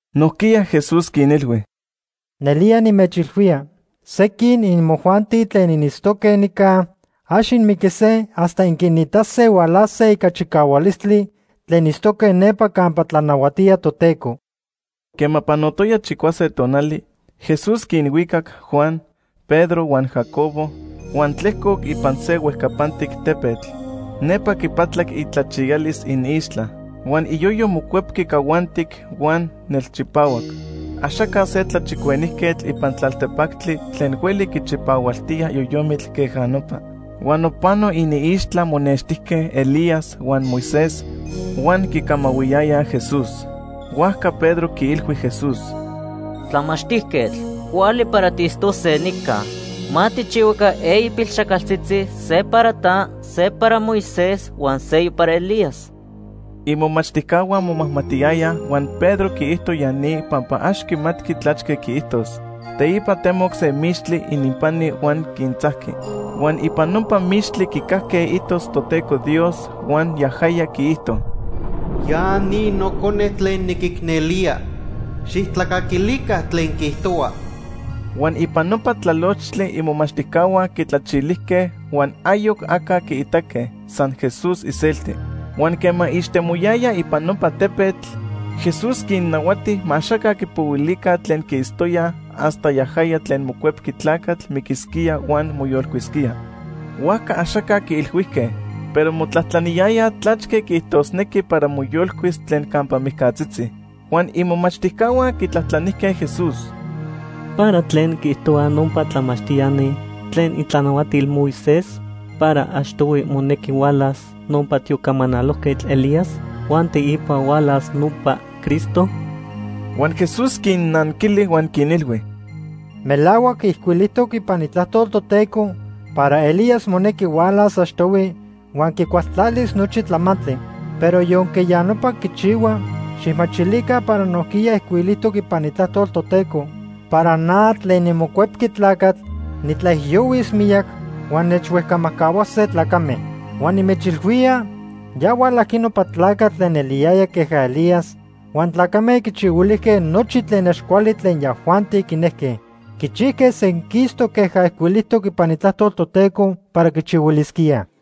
Nojquiya Jesús quinilhui: ―Nelía nimechilhuía, sequin imojuanti tlen initztoque nica ax inmiquise hasta inquinitase hualase ica chicahualistli tlen itztoque nepa campa tlanahuatía Toteco. Quema panotoya chicuase tonali, Jesús quinhuicac Juan, Pedro huan Jacobo huan tlejcoc ipan se huejcapantic tepetl. Nepa quipatlac itlachiyalis iniixtla. Huan iyoyo mocuepqui cahuantic huan nelchipahuac. Axaca se tlachicuenijquetl ipan tlaltepactli tlen hueli quichipahualtía yoyomitl queja nopa. Huan nopano iniixtla monextijque Elías huan Moisés huan quicamahuiyayaj Jesús. Huajca Pedro quiilhui Jesús: ―Tlamachtijquetl, cuali para tiitztose nica. Ma tijchihuaca eyi pilxajcaltzitzi: se para ta, se para Moisés, huan seyoc para Elías. Imomachtijcahua momajmatiyayaj huan Pedro quiijto ya ni pampa ax quimatqui tlachque quiijtos. Teipa temoc se mixtli ininpani huan quintzajqui. Huan ipan nopa mixtli quicajque itos Toteco Dios huan yajaya quiijto: “Ya ni Nocone tlen niquicnelía, xijtlacaquilica tlen quiijtohua.” Huan ipan nopa tlalochtli imomachtijcahua quitlachilijque huan ayoc aca quiitaque, san Jesús iselti. Huan quema ixtemoyayaj ipan nopa tepetl, Jesús quinnahuati ma axaca quipohuilica tlen quiitztoyaj hasta yajaya tlen Mocuepqui Tlacatl miquisquía huan moyolcuisquía. Huajca axaca quiilhuijque, pero motlajtlaniyayaj tlachque quiijtosnequi para moyolcuis tlen campa mijcatzitzi. Huan imomachtijcahua quitlajtlanijque Jesús: ―¿Para tlen quiijtohuaj nopa tlamachtiani tlen itlanahuatil Moisés para achtohui monequi hualas nopa tiocamanalojquetl Elías huan teipa hualas nopa Cristo? Huan Jesús quinnanquili huan quinilhui: ―Melahuac ijcuilijtoc ipan Itlajtol Toteco para Elías monequi hualas achtohui huan quicualtlalis nochi tlamantli. Pero yonque ya nopa quichihua, xijmachilica para nojquiya ijcuilijtoc ipan Itlajtol Toteco para na tlen niMocuepqui Tlacatl nitlaijiyohuis miyac huan nechhuejcamajcahuase tlacame. Huan nimechilhuía ya hualajqui nopa tlacatl tlen eliyaya queja Elías huan tlacame quichihuilijque nochi tlen ax cuali tlen yajuanti quinejque. Quichijque senquistoc queja ijcuilijtoc ipan Itlajtol Toteco para quichihuilisquíaj.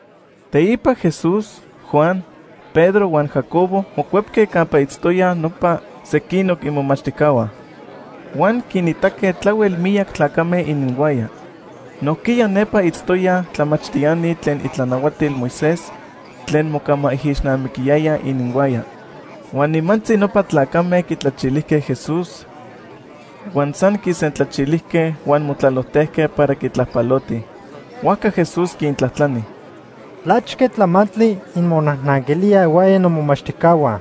Teipa Jesús, Juan, Pedro huan Jacobo mocuepque campa itztoyaj nopa sequinoc imomachtijcahua. Huan quinitaque tlahuel miyac tlacame ininhuaya. Nojquiya nepa itztoyaj tlamachtiani tlen itlanahuatil Moisés tlen mocamaijixnamiquiyayaj ininhuaya. Huan nimantzi nopa tlacame quitlachilijque Jesús, huan san quisentlachilijque huan motlalojtejque para quitlajpalotij. Huajca Jesús quintlajtlani: ―¿Tlachque tlamantli inmonajnanquilíaj ihuaya nomomachtijcahua?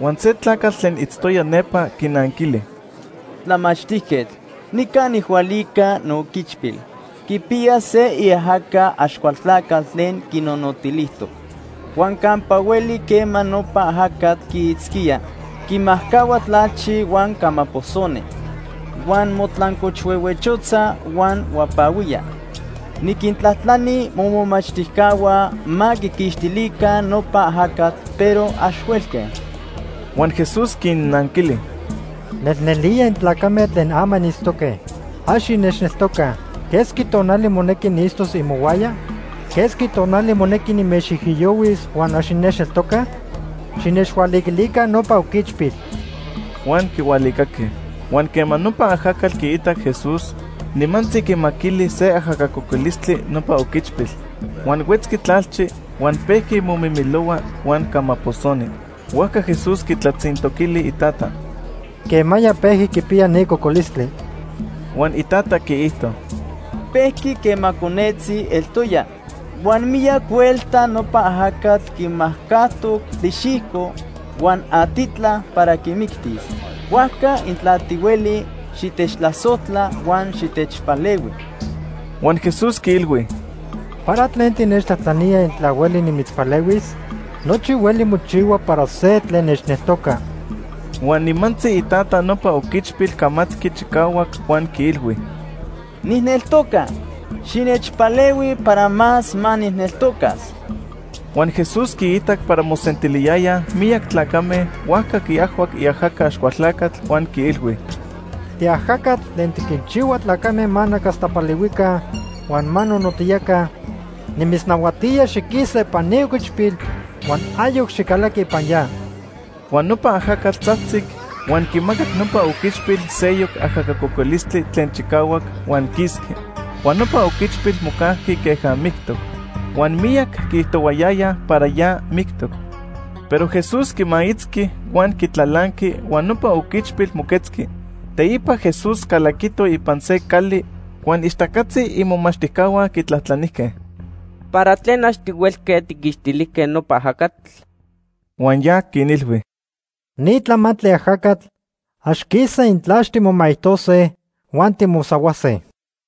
Huan se tlacatl tlen itztoya nepa quinanquili: ―Tlamachtijquetl, nica nijhualica nooquichpil. Quipiya se iajaca Axcualtlacatl tlen quinonotilijtoc. Huan campa hueli quema nopa ajacatl quiitzquía, quimajcahua tlalchi huan camaposoni. Huan motlancochhuehuechotza huan huapahuía. Niquintlajtlani momomachtijcahua ma quiquixtilica nopa ajacatl, pero ax huelque. Huan Jesús quinnanquili: ―¡Nelnelía intlacame tlen ama initztoque! ¡Ax innechneltocaj! ¿Quesqui tonali monequi niitztos imohuaya? ¿Quesqui tonali monequi nimechijiyohuis huan ax innechneltocaj? ¡Xinechhualiquilica nopa oquichpil! Huan quihualicaque. Huan quema nopa ajacatl quiitac Jesús, nimantzi quimaquili se ajaca cocolistli nopa oquichpil. Huan huetzqui tlalchi, huan pejqui momimilohua huan camaposoni. Huajca Jesús quitlatzintoquili itata: ―¿Quemaya pejqui quipiya ni cocolistli? Huan itata quiijto: ―Pejqui quema conetzi eltoya. Huan miyac huelta nopa ajacatl quimajcajtoc tlixijco huan atitla para quimictis. Huajca intla tihueli, xitechtlasojtla huan xitechpalehui. Huan Jesús quiilhui: ―¿Para tlen tinechtlajtlanía intla hueli nimitzpalehuis? Nochi hueli mochihua para se tlen nechneltoca. Huan nimantzi itata nopa oquichpil camatqui chicahuac huan quiilhui: ―¡Nijneltoca! ¡xinechpalehui para más ma nijneltocas! Huan Jesús quiitac para mosentiliyayaj miyac tlacame, huajca quiajhuac iajaca Axcualtlacatl, huan quiilhui: ―Tiajacatl tlen tiquinchihua tlacame ma nacastapalihuica huan ma nonotiyaca, nimitznahuatía xiquisa ipan ni oquichpil huan ayoc xicalaqui ipan ya. Huan nopa ajacatl tzajtzic, huan quimacac nopa oquichpil seyoc ajaca cocolistli tlen chicahuac, huan quisqui. Huan nopa oquichpil mocajqui queja mictoc. Huan miyac quiijtohuayayaj para ya mictoc. Pero Jesús quimaitzqui huan quitlalanqui huan nopa oquichpil moquetzqui. Teipa Jesús calaquito ipan se cali huan ixtacatzi imomachtijcahua quitlajtlanijque: ―¿Para tlen ax tihuelque tijquixtilijque nopa ajacatl? Huan ya quinilhui: ―Ni tlamantli ajacatl ax quisaj intla ax timomaijtose huan timosahuase.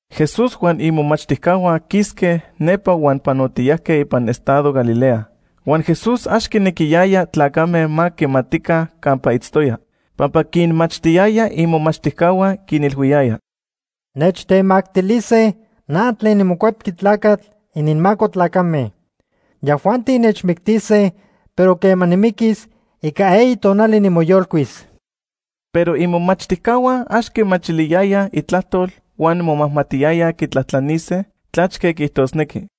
Jesús huan imomachtijcahua quisque nepa huan panotiyajque ipan estado Galilea. Huan Jesús ax quinequiyaya tlacame ma quimatica campa itztoya, pampa quinmachtiyaya imomachtijcahua. Quinilhuiyaya: ―Nechtemactilise na tlen niMocuepqui Tlacatl ininmaco tlacame. Yajuanti nechmictise, pero quema nimiquis, ica eyi tonali nimoyolcuis. Pero imomachtijcahua ax quimachiliyayaj itlajtol huan momajmatiyayaj quitlajtlanise tlachque quiijtosnequi.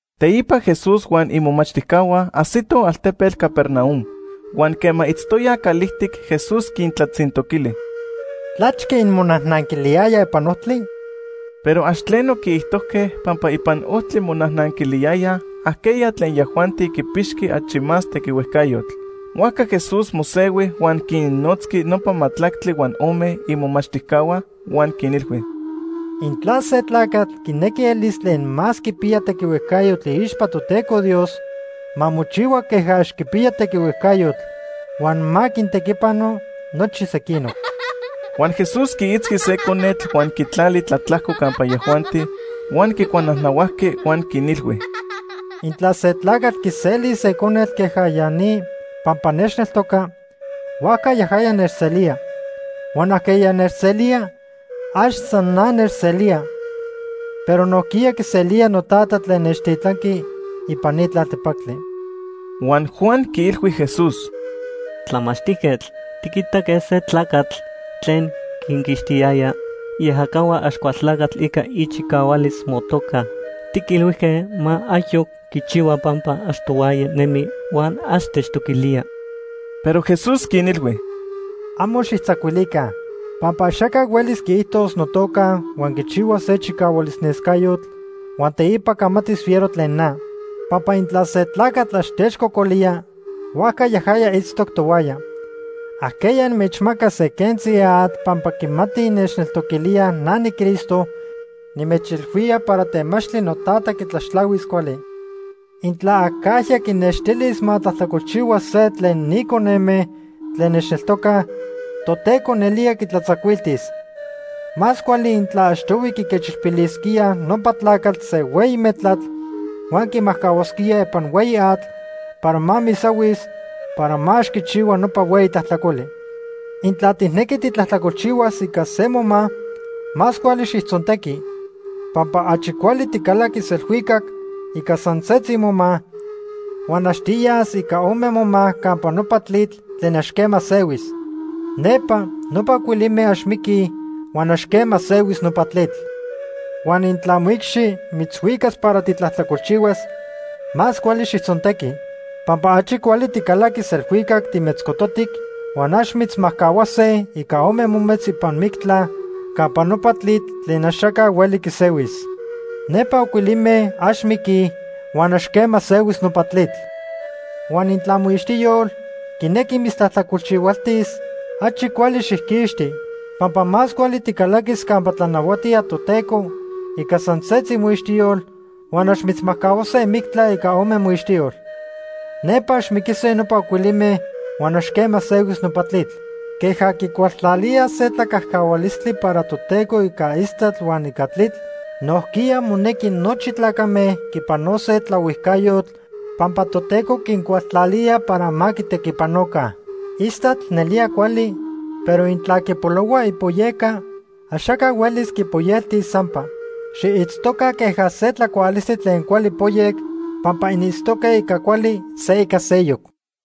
Teipa Jesús huan imomachtijcahua ajsitoj altepetl Capernaum. Huan quema itztoyaj calijtic, Jesús quintlatzintoquili: ―¿Tlachque inmonajnanquiliyayaj ipan ojtli? Pero ax tleno quiijtojque pampa ipan ojtli monajnanquiliyayaj ajqueya tlen yajuanti quipixqui achi más tequihuejcayotl. Huajca Jesús mosehui huan quinnotzqui nopa majtlactli huan ome imomachtijcahua, huan quinilhui: ―Intla se tlacatl quinequi elis tlen más quipiya tequihuejcayotl iixpa Toteco Dios, ma mochihua queja ax quipiya tequihuejcayotl huan ma quintequipano nochi sequinoc. Huan Jesús quiitzqui se conetl huan quitlali tlatlajco campa yajuanti. Huan quicuanajnahuajqui huan quinilhui: ―Intla se tlacatl quiselis se conetl queja ya ni pampa nechneltoca, huajca yajaya nechselía. Huan ajqueya nechselía, ax san na nechselía, pero nojquiya quiselía noTata tlen nechtitlanqui ipan ni tlaltepactli. Huan Juan quiilhui Jesús: ―Tlamachtijquetl, tiquitaque se tlacatl tlen quinquixtiyaya iajacahua Axcualtlacatl ica ichicahualis motoca. Tiquilhuijque ma ayoc quichihua pampa ax tohuaya nemi huan ax techtoquilía. Pero Jesús quinilhui: ―Amo xijtzacuilica, pampa axaca hueli quiijtos notoca huan quichihua se chicahualis nescayotl huan teipa camatis fiero tlen na. Pampa intla se tlacatl ax techcocolía, huajca yajaya itztoc tohuaya. Ajqueya inmechmacas se quentzi atl pampa quimati innechtoquilíaj na niCristo, nimechilhuía para temachtli noTata quitlaxtlahuis cuali. “Intla acajya quinextilis ma tlajtlacolchihua se tlen ni coneme tlen nechneltocaj, Toteco nelía quitlatzacuiltis. Más cuali intla achtohui quiquechilpilisquíaj nopa tlacatl se hueyi metlatl huan quimajcahuasquíaj ipan hueyi atl para ma misahuis para ma ax quichihua nopa hueyi tlajtlacoli. Intla tijnequi titlajtlacolchihuas ica se moma, más cuali xijtzontequi. Pampa achi cuali ticalaquis elhuicac ica san setzi moma, huan ax tiyas ica ome moma campa nopa tlitl tlen ax quema sehuis. Nepa nopa ocuilime ax miquij huan ax quema sehuis nopa tlitl. Huan intla moicxi mitzhuicas para titlajtlacolchihuas, más cuali xijtzontequi. Pampa achi cuali ticalaquis elhuicac timetzcototic, huan ax mitzmajcahuase ica ome mometz ipan mictla campa nopa tlitl tlen axaca hueli quisehuis. Nepa ocuilime ax miquij huan ax quema sehuis nopa tlitl. Huan intla moixtiyol quinequi mitztlajtlacolchihualtis, achi cuali xijquixti. Pampa más cuali ticalaquis campa tlanahuatía Toteco ica san setzi moixtiyol huan ax mitzmajcahuase mictla ica ome moixtiyol. Nepa ax miquise nopa ocuilime huan ax quema sehuis nopa tlitl. “Queja quicualtlalíaj se tlacajcahualistli para Toteco ica istatl huan ica tlitl, nojquiya monequi nochi tlacame quipanose tlaohuijcayotl pampa Toteco quincualtlalía para ma quitequipanoca. Istatl nelía cuali, pero intla quipolohua ipoyeca, axaca huelis quipoyeltis sampa. Xiitztoca queja se tlacualistli tlen cuali poyec pampa initztoque ica cuali se ica seyoc.”